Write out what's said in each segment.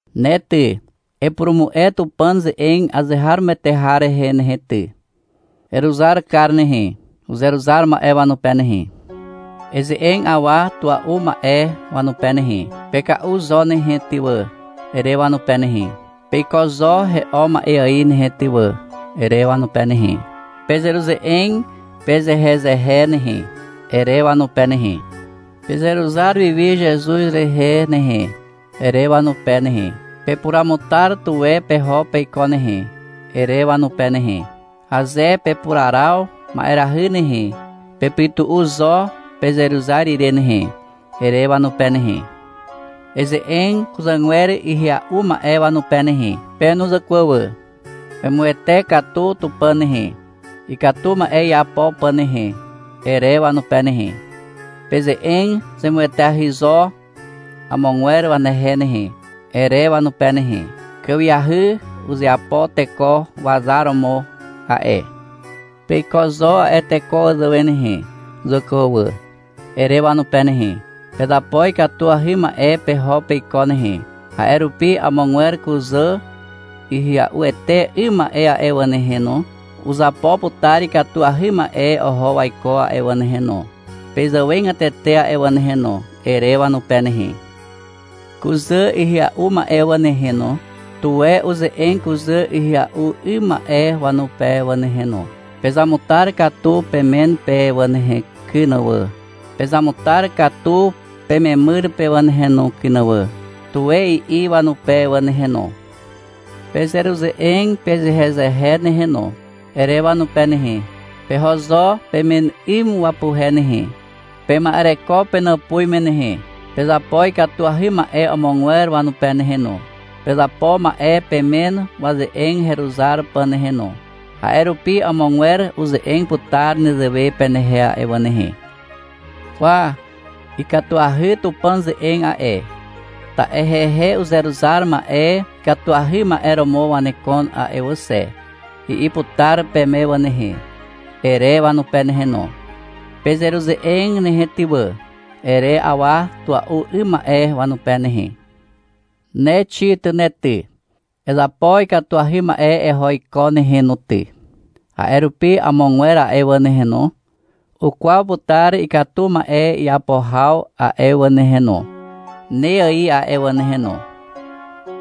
Ne ty, epurumu'e Tupàn ze'eg azeharomoete har rehe nehe ty. Eruzar kar nehe, uzeruzar ma'e wanupe nehe. Eze'eg awa tua'u ma'e wanupe nehe. — Peka'u zo nehe ty wà, ere wanupe nehe. — Peiko zo he'o ma'e ài nehe ty wà, ere wanupe nehe. — Pezeruze'eg pezehezehe nehe, ere wanupe nehe. — Pezeruzar wiwi Zezuz rehe nehe, ere wanupe nehe. — Pepuruamutar tuwe peho peiko nehe, ere wanupe nehe. — Aze pepuraraw ma'erahy nehe, pepytu'u zo pezeruzar ire nehe, ere wanupe nehe. Eze'eg kuzàgwer ihya'u ma'e wanupe nehe. — Pe no zàkwà wà. Pemuwete katu Tupàn nehe, ikatu ma'e iapo pà nehe, ere wanupe nehe. — Peze'eg zemueteahy zo amogwer wanehe nehe, ere wanupe nehe. Kàwiahy uzeapo teko wazar romo a'e. Peiko zo a'e teko wazàwe nehe, zàkwà wà, ere wanupe nehe. — Pezapo ikatuahy ma'e peho peiko nehe, a'e rupi amogwer kuzà ihya'uete 'ym ma'e a'e wà nehe no, uzapo putar ikatuahy ma'e oho waiko a'e wà nehe no, pezàwegatete a'e wà nehe no, ere wanupe nehe. Kuzà ihya'u ma'e wà nehe no, tuwe uze'eg kuzà ihya'u 'ym ma'e wanupe wà nehe no. — Pezamutar katu pemen pe wà nehe kyn wà, pezamutar katu pememyr pe wà nehe no kyn wà, tuwe i'i wanupe wà nehe no. — Pezeruze'eg pezehezehe nehe no, ere wanupe nehe. — Peho zo pemen 'ym wapuhe nehe. Pema'ereko penàpuz me nehe. Pezapo ikatuahy ma'e amogwer wanupe nehe no. Pezapo ma'e pemen waze'eg heruzar pà nehe no. A'e rupi, amogwer uze'eg putar nezewe penehe a'e wà nehe. — Kwa, ikatuahy Tupàn ze'eg a'e, ta'e hehe uzeruzar ma'e ikatuahy ma'e romo wanekon a'e wà xe, i'i putar peme wà nehe, ere wanupe nehe no. — Pezeruze'eg nehe ty wà, ere awa tua'u 'ym ma'e wanupe nehe. Ne Xit ne ty, ezapo ikatuahy ma'e eho iko nehe no ty. A'e rupi amogwer a'e wà nehe no, ukwaw putar ikatu ma'e iapo haw a'e wà nehe no, ne ài a'e wà nehe no.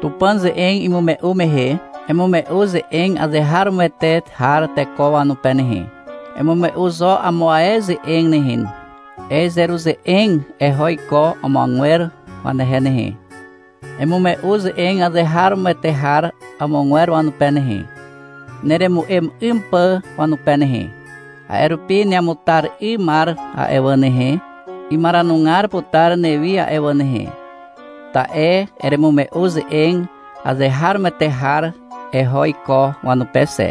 Tupàn ze'eg imume'u mehe, emume'u ze'eg azeharomoete har teko wanupe nehe. Emume'u zo amo ae ze'eg nehe. Ezeruze'eg eho iko amogwer wanehe nehe. Emume'u ze'eg azeharomoete har amogwer wanupe nehe, neremu'em 'ym pà wanupe nehe. A'e rupi neamutar 'ymar a'e wà nehe, imaranugar putar newi a'e wà nehe, ta'e eremume'u ze'eg azeharomoete har eho iko wanupe xe.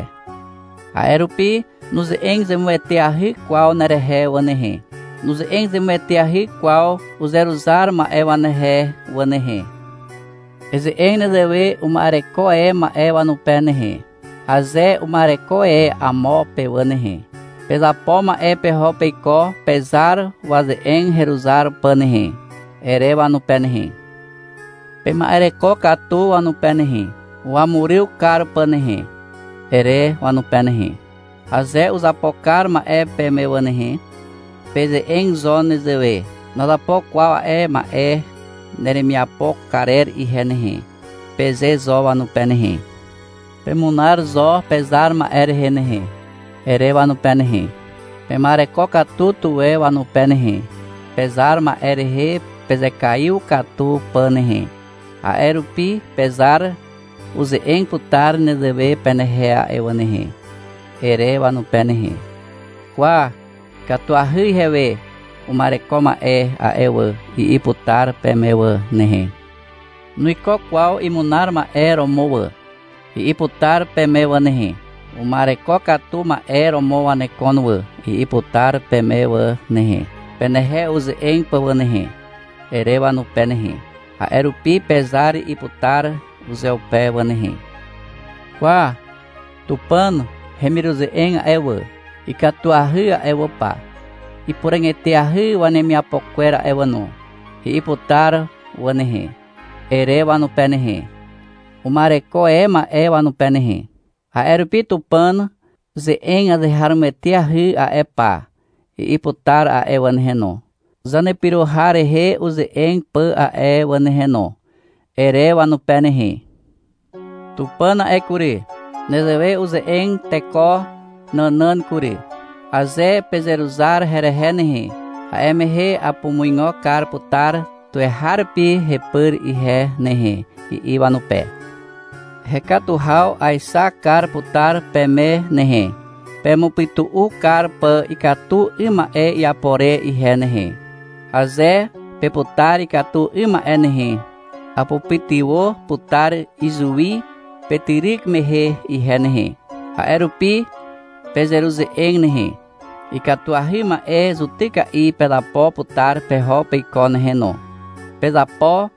A'e rupi nuze'eg zemueteahy kwaw zanerehe wà nehe. Nuze'eg zemueteahy kwaw uzeruzar ma'e wanehe wà nehe. Eze'eg nezewe uma'ereko e ma'e wanupe nehe, aze uma'ereko e amo pe wà nehe. — Pezapo ma'e peho peiko pezar waze'eg heruzar pà nehe, ere wanupe nehe. — Pema'ereko katu wanupe nehe, wamuryw kar pà nehe, ere wanupe nehe. Aze uzapo kar ma'e peme wà nehe, peze'eg zo nezewe, — Nazapo kwaw a'e ma'e neremiapo karer ihe nehe, peze zo wanupe nehe. — Pemunar zo pezar ma'e rehe nehe, ere wanupe nehe. — Pema'ereko katu tuwe wanupe nehe, pezar ma'e rehe pezekaiw katu pà nehe. A'e rupi pezar uze'eg putar nezewe penehe a'e wà nehe, ere wanupe nehe. — Kwa, ikatuahy ihewe uma'ereko ma'e a'e wà, i'i putar peme wà nehe. — Nuiko kwaw imunar ma'e romo wà, i'i putar peme wà nehe. — Uma'ereko katu ma'e romo wanekon wà, i'i putar peme wà nehe, penehe uze'eg pà wà nehe, ere wanupe nehe. — A'e rupi pezar i'i putar uzeupe wà nehe. — Kwa, Tupàn hemiruze'eg a'e wà, ikatuahy a'e wà pa, ipuràg eteahy wanemiapo kwer a'e wà no, i'i putar wà nehe, ere wanupe nehe, uma'ereko e ma'e wanupe nehe. — A'e rupi Tupàn ze'eg azeharomoeteahy a'e pa, i'i putar a'e wà nehe no, zanepyro har rehe uze'eg pà a'e wà nehe no, ere wanupe nehe. Tupàn a'e kury, nezewe uze'eg teko nànàn kury. — Aze pezeruzar herehe nehe, a'e mehe apumuigo kar putar tuweharupi hepyr ihe nehe, i'i wanupe. — Hekatu haw aexak kar putar peme nehe, pemupytu'u kar pà ikatu 'ym ma'e iapo re ihe nehe. Aze peputar ikatu 'ym ma'e nehe, apupytywà putar izuwi petyryk mehe ihe nehe. A'e rupi pezeruze'eg nehe. Ikatuahy ma'e zutyka'i pezapo putar peho peiko nehe no. Pezapo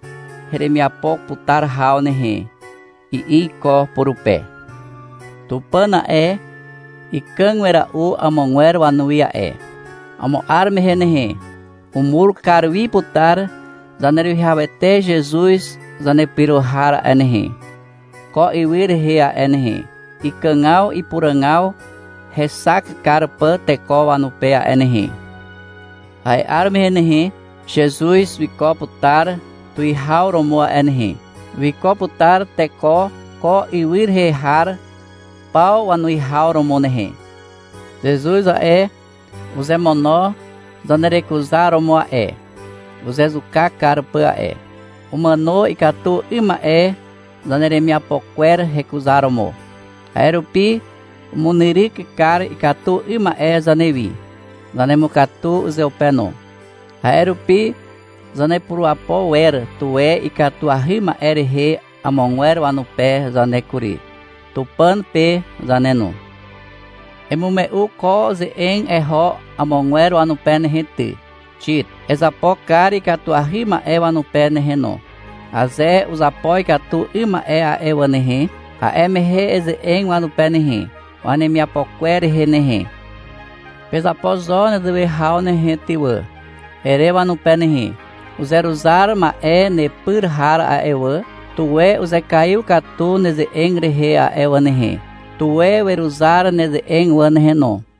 heremiapo putar haw nehe, i'i iko purupe. Tupàn a'e, ikàg wera'u amogwer wanuwi a'e. Amo 'ar mehe nehe, umur kar wi putar Zaneruwihawete Zezuz Zanepyro har a'e nehe, ko ywy rehe a'e nehe, ikàgaw ipuràgaw hexak kar pà teko wanupe a'e nehe. A'e 'ar mehe nehe, Zezuz wiko putar tuwihaw romo a'e nehe. Wiko putar teko ko ywy rehe har paw wanuwihaw romo nehe. Zezuz a'e, uzemono zanerekuzaromo a'e, uzezuka kar pà a'e. Umàno ikatu 'ym ma'e zaneremiapo kwer hekuzaromo. A'e rupi umunyryk kar ikatu 'ym ma'e zanewi. Zanemukatu uzeupe no. A'e rupi zanepurapo wer tuwe ikatuahy ma'e rehe amogwer wanupe zane kury, Tupàn pe zane no. Emume'u ko ze'eg eho amogwer wanupe nehe ty, Xit. Ezapo kar ikatuahy ma'e wanupe nehe no. Aze uzapo ikatu 'ym ma'e a'e wà nehe, a'e mehe eze'eg wanupe nehe, wanemiapo kwer rehe nehe. — Pezapo zo nezewe haw nehe ty wà, ere wanupe nehe. Uzeruzar ma'e nepyr har a'e wà, tuwe uzekaiw katu neze'eg rehe a'e wà nehe. Tuwe weruzar neze'eg wà nehe no.